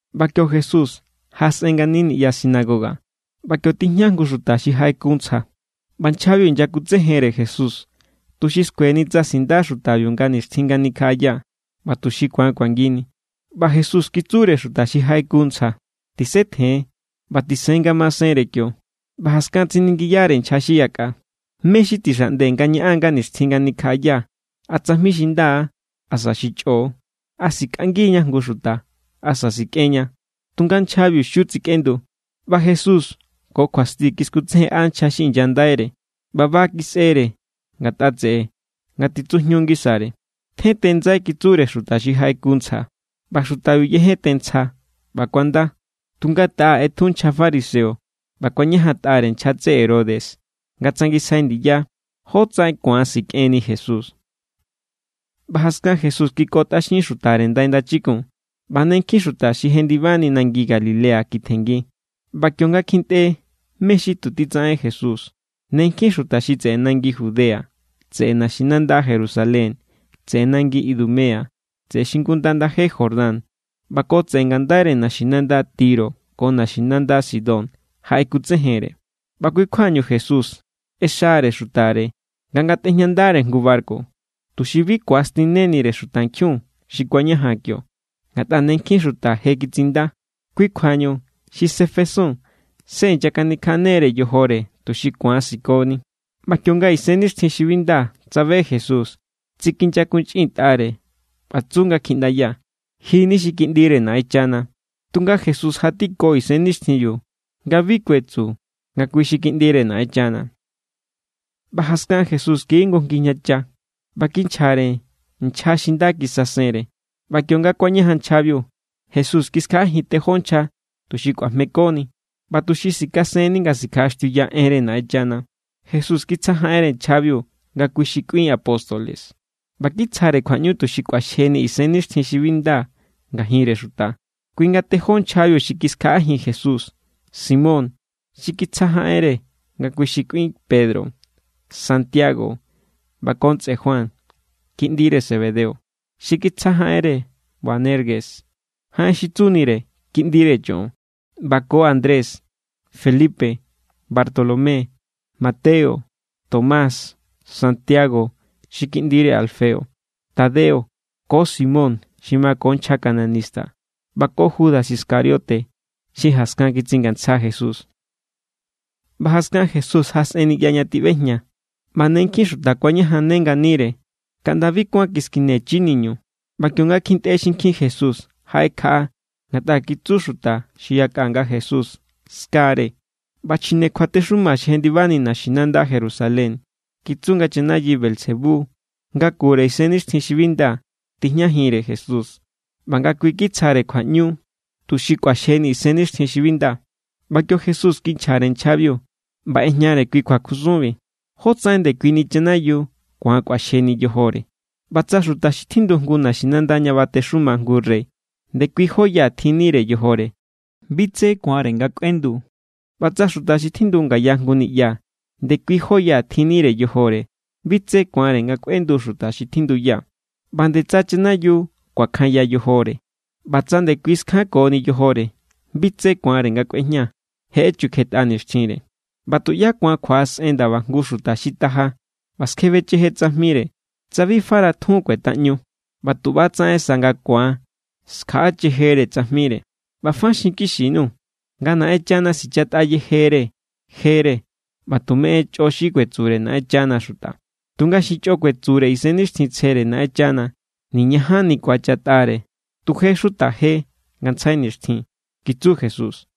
ꞌBa kio Jesús jaꞌasꞌen ngani niꞌya sinagoga; ꞌba kio tijña jngu xuta xi jaꞌeku ntsja. ꞌBa nchjabiu inyakutsejenre Jesús tuxi skueni tsa sinda xutabiu nga nixtjin nga nikjaꞌaya, ꞌba tuxi ku̱an kuangini. ꞌBa Jesús kitsure xuta xi jaꞌeku ntsja: —Tisetjen ꞌba tisen ngamasenre kio. ꞌBa jaskan tsiningiyare nchja xi yakꞌa: —¿Mé xi tixaꞌnde nga ñaꞌan nga nixtjin nga nikjaꞌaya, a tsajmi xi nda= asa xi chꞌo? ¿A sikꞌangiña jngu xuta, asa sikꞌenña? Tunga nchjabiu xiu tsikꞌendu. ꞌBa Jesús ko kjuasti kiskutsejenꞌa nchja xi inyandaire, ꞌba ba kisꞌere ngatꞌa tseꞌe nga titsujñu ngisare. —Tjente ndsai —kitsure xuta xi jaꞌeku ntsja. ꞌBa xutabiu yejente ntsja, ꞌba kuanda. Tunga taꞌa ꞌetju nchja fariseo ꞌba kuañajantꞌare nchja tseꞌe Herodes nga tsangisjai ndiya jotsaꞌen ku̱an sikꞌenni Jesús. ꞌBa jaskan Jesús kikotꞌaxin xutare ndai ndachikun, ꞌba ne nkjin xuta xi jendibani nangi Galilea kitjenngi. ꞌBa kionga kjintꞌe mé xi tu titsaꞌen Jesús, ne nkjin xuta xi tseꞌe nangi Judea, tseꞌe naxinanda Jerusalén, tseꞌe nangi Idumea, tseꞌe xingunda ndaje Jordán ꞌba ko tseꞌe ngandaire naxinanda Tiro ko naxinanda Sidón jaꞌekutsejenre. ꞌBa kui= kjuañu Jesús ꞌexare xutare nga ngatꞌejñandare jngu barku, tuxi bi ku̱astinnenire xutankjiun xi kuañajan kio. Ngatꞌa ne nkjin xuta je kitsinda, kui kjuañu xi sefesun se inyakanikjaꞌane=re yojore tuxi ku̱an sikoni. ꞌBa kionga isennixtjinnkjin xi bi nda tsabe Jesús, tsikinyakunchꞌintꞌare ꞌba tsu nga kjiꞌndaya: —¡Ji= ni xi Kiꞌndire Naꞌenchana! Tunga Jesús jatiko isennixtjinbiu nga bi kuetsu nga kui xi Kiꞌndire Naꞌenchana. ꞌBa jaskan Jesús kiji jngu ngijñacha, ꞌba kinchjare nchja xi nda kisasenre. ꞌBa kionga kuañajan nchjabiu, Jesús kiskjaꞌajin tejó nchja tuxi kꞌuajmekoni, ꞌba tuxi sikasenni nga sikjaꞌaxtiuya enre Naꞌenchana. Jesús kitsjajaꞌenre nchjabiu nga kui xi kꞌuin apóstoles; ꞌba kitsjare kjuaꞌñu tuxi kꞌuaxjejinni isennixtjin xi bi nda ngajinre xuta. Kui nga tejó nchjabiu xi kiskjaꞌajin Jesús: Simón, xi kitsjajaꞌenre nga kui xi kꞌuin Pedro; Santiago ꞌba ko ntsꞌe Juan, kiꞌndire Zebedeo, xi kitsjajaꞌenre Boanerges (jaꞌen xi tsunire: Kiꞌndire Choꞌon); ꞌba ko Andrés, Felipe, Bartolomé, Mateo, Tomás, Santiago xi kiꞌndire Alfeo; Tadeo, ko Simón, xi mako nchja cananista, ꞌba ko Judas Iscariote, xi jaskan kitsingantsja Jesús. ꞌBa jaskan, Jesús jaꞌasꞌen niꞌya ña tiꞌbejña, ꞌba ne nkjin xuta kuañajanne nganire, kaꞌnda bi kuán kiskine chi niñu. ꞌBa kionga kjintꞌe xinkjin Jesús, jaꞌekjaꞌa, ngatꞌa kitsu xuta xi yakꞌa nga Jesús skare. ꞌBa chjine kjuatexuma xi jendibani naxinanda Jerusalén kitsu nga chanayi Beelzebú, ngakure isennixtjin xi bi nda, tijñajinre Jesús ꞌba nga kui kitsjare kjuaꞌñu tuxi kꞌuaxjejinni isennixtjin xi bi nda. ꞌBa kio Jesús kinchjare nchjabiu, ꞌba ꞌejñare kui kjuakusunbi: —¿Jótsaꞌen ndekuini chanayiu ku̱an kꞌuaxjejinni yojore? ꞌBa tsa xuta xi tjindu jngu naxinanda ña batexuma jngu rey ndekui jóya tjinnire yojore, bi tsé ku̱anre nga kꞌuendu. ꞌBa tsa xuta xi tjindu ngaya jngu niꞌya ndekui jó ya tjinnire yojore, bi tsé ku̱anre nga kꞌuendu xuta xi tjinduya. ꞌBa nde tsa chanayiu kuakjanya yojore, ꞌba tsa ndekui skjankoni yojore, bi tsé ku̱anre nga kꞌuejña. Je echukjetꞌa nixtjinre. ’ꞌBa tuꞌyá ku̱an kjuaꞌasꞌen ndaba jngu xuta xi taja ꞌba skjebecheje tsajmire, tsa bi fara tjun kuetaꞌñu; ꞌba tu ꞌba= tsaꞌen sa nga ku̱an skjaꞌachejere tsajmire. ’ꞌBa fa xinkixi_nuu̱, nga Naꞌenchana sichatꞌa yejere jere ꞌba tume en chꞌo xi kuetsure Naꞌenchana xuta; tunga xi chꞌo kuetsure Isennixtjintsjere Naꞌenchana, niñajanni ku̱achatꞌare. Tu je= xuta je ngantsjai nixtjin —kitsu Jesús.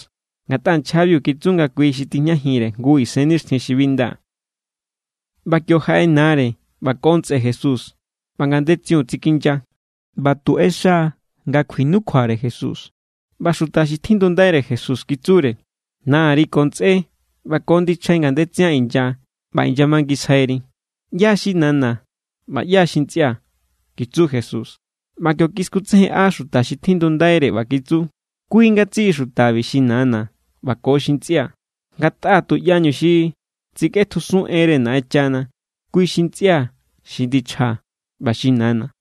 Ngatꞌa nchjabiu kitsu nga kui xi tijñajinre jngu isennixtjin xi bi nda. ꞌBa kio jaꞌe nare ꞌba ko ntsꞌe Jesús ꞌba ngandetsiun tsikinya ꞌba tu ꞌexa nga kjuinukjuare Jesús. ꞌBa xuta xi tjindundaire Jesús kitsure: —Nari ko ntsꞌé ꞌba ko ndichjai ngandetsian inya ꞌba inyamangisjairi. —¿ꞌYá= xi nana̱ ꞌba ꞌyá= xi ntsꞌia̱? —kitsu Jesús. ꞌBa kio kiskutsejenꞌa xuta xi tjindundaire ꞌba kitsu: —Kui ngatsiꞌi xutabi xi nana̱ ꞌba ko xi ntsꞌia̱. Ngatꞌa tuꞌyañu xi tsikꞌetjusun enre Naꞌenchana, kui xi ntsꞌia̱ xi ndichjaa̱ ꞌba xi nana̱.